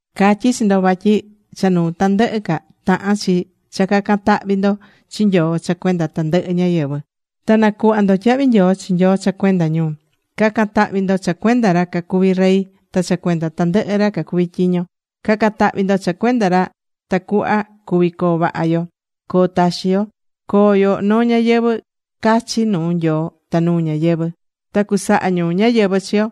Catyí chi ndo vatyi cha nuu tandɨhɨ ca, tahán chi cha ca̱can tahvi ndo chi Nyoo cha cuenda tandɨhɨ ñáyɨvɨ. Ta na̱cuhva ndo tyahvi nyoo chi Nyoo cha cuenda ñu. Ca̱can tahvi ndo cha cuenda ra cacuvi rey ta cha cuenda tandɨhɨ ra cacuví tyiño. Ca̱can tahvi ndo cha cuenda ra tacuhva cuvi coo vaha yo, coo taxi yo, coo yo noo ñayɨvɨ̱ cachi nuu Nyoo ta nuu ñáyɨvɨ. Ta cusaha ñu ñáyɨvɨ chi yo.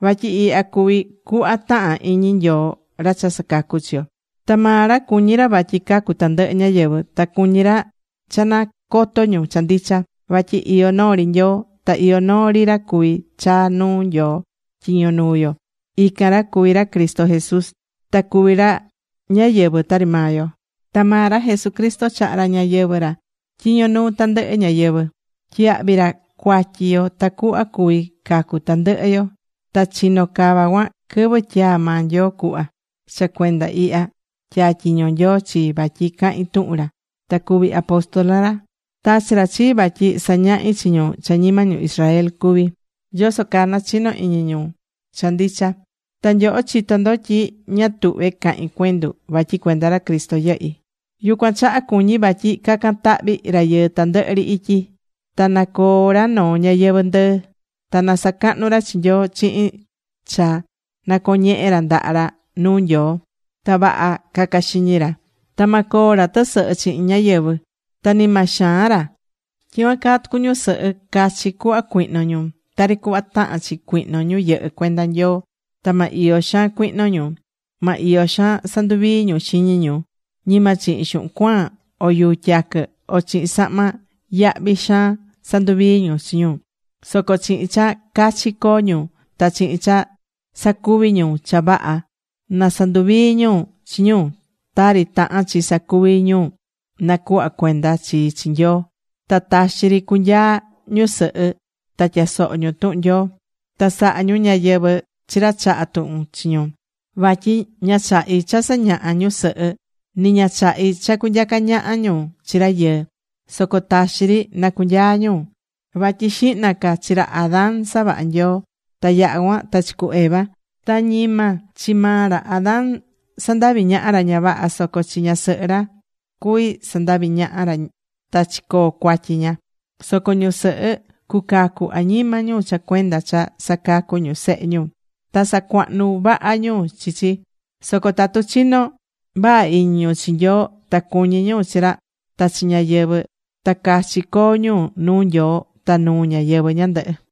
Vatyi ihya cuví cuhva tahán iñi Nyoo ra cha sacacú chi yo. Ta maa ra cuñí ra vatyi cacu tandɨhɨ ñáyɨvɨ. Ta cuñí ra cha nacoto ñu cha ndicha. Vatyi iyó noo ri Nyoo. Ta iyó noo ri ra cuví chaa nuu Nyoo tyiño nuu yo. Ican ra cuví ra Cristo Jesús. Ta cuví ra ñáyɨvɨ tari maa yo. Ta maa ra Jesucristo chaha̱ ra ñayɨvɨ̱ ra tyiño nuu tandɨhɨ ñáyɨvɨ. Tyiyahvi̱ ra cuatyi yo tacuhva cuvi cacu tandɨhɨ yo. Ta chino̱ cava cuan quɨvɨ tyaa̱ maa Nyoo cuhva. Cha cuenda ihya, tyatyiño̱ Nyoo chii, vatyi cahin tuhun ra, ta cuvi apóstol ra, tachi̱ ra chii vatyi sañahi chi ñu cha ñima ñu Israel cuví, yoso caa nachino iñi ñu cha ndicha. Ta nyoho chitó ndo tyi ña tuhvé cahín cuendu vatyi cuenda ra Cristo yɨhí. Yucuan chaha cuñí vatyi ca̱can tahvi rayɨɨ tandɨhɨ ri ityi. Ta na coo ra noo ñayɨvɨ̱ ndɨɨ. Ta na sacahnu ra chi Nyoo chihin cha nacoñehe ra ndaha ra nuu Nyoo. Ta vaha ca̱ca xiñi ra. Ta ma coo ra tɨsɨhɨ chihin ñáyɨvɨ. Ta ni ma xaan ra. Tyicuan caa tucu ñusɨhɨ. Cachi cuhva cui̱hno ñu, tari cuhva tahán chi cuihno ñu yɨhɨ́ cuenda Nyoo. Ta ma iyo xaan cuihno ñu. Ma iyo xaan sanduvii ñu xiñi ñu. Ñima chihin xuhun cuaan o yuu tyaquɨ, o chihin sahma yahvi xaan sanduvii ñu chi ñu. Soco chihin cha cachi coo ñu ta chihin cha sacuvi ñu cha vaha na sanduvii ñu chi ñu, tari tahán chi sacuvi ñu nacuhva̱ cuenda chi chi Nyoo. Ta taxi ri cu̱nyaa ñusɨhɨ ta tya̱soho ñu tuhun Nyoo. Ta sa̱ha ñu ñáyɨvɨ chi ra chahá tuhun chi ñu. Vatyi ña chahí cha sañaha ñusɨhɨ. Ni ña chahí cha cunyaca ñaha ñu chi rayɨɨ. Soco taxi ri na cunyaa ñu. Vatyi xihna ca chi ra Adán savaha̱ Nyoo ta yaha̱ cuan ta chi cu Eva. Ta ñima chi maa ra Adán sandavi̱ ñaha ra ña vaha, soco chi ñasɨhɨ ra cuvi̱ sandavi̱ ñaha ra ta chicoo̱ cuatyi ña. Soco ñusɨhɨ cucacu añima ñu cha cuenda cha sacacú ñu sehe ñu, ta sacuahnú vaha ñu chi chi. Soco tatu chinó vaha iñi ñu chi Nyoo ta cuñí ñu chi ra ta chi ñáyɨvɨ, ta cachi coo ñu nuu Nyoo ta nuu ñáyɨvɨ ñandɨhɨ.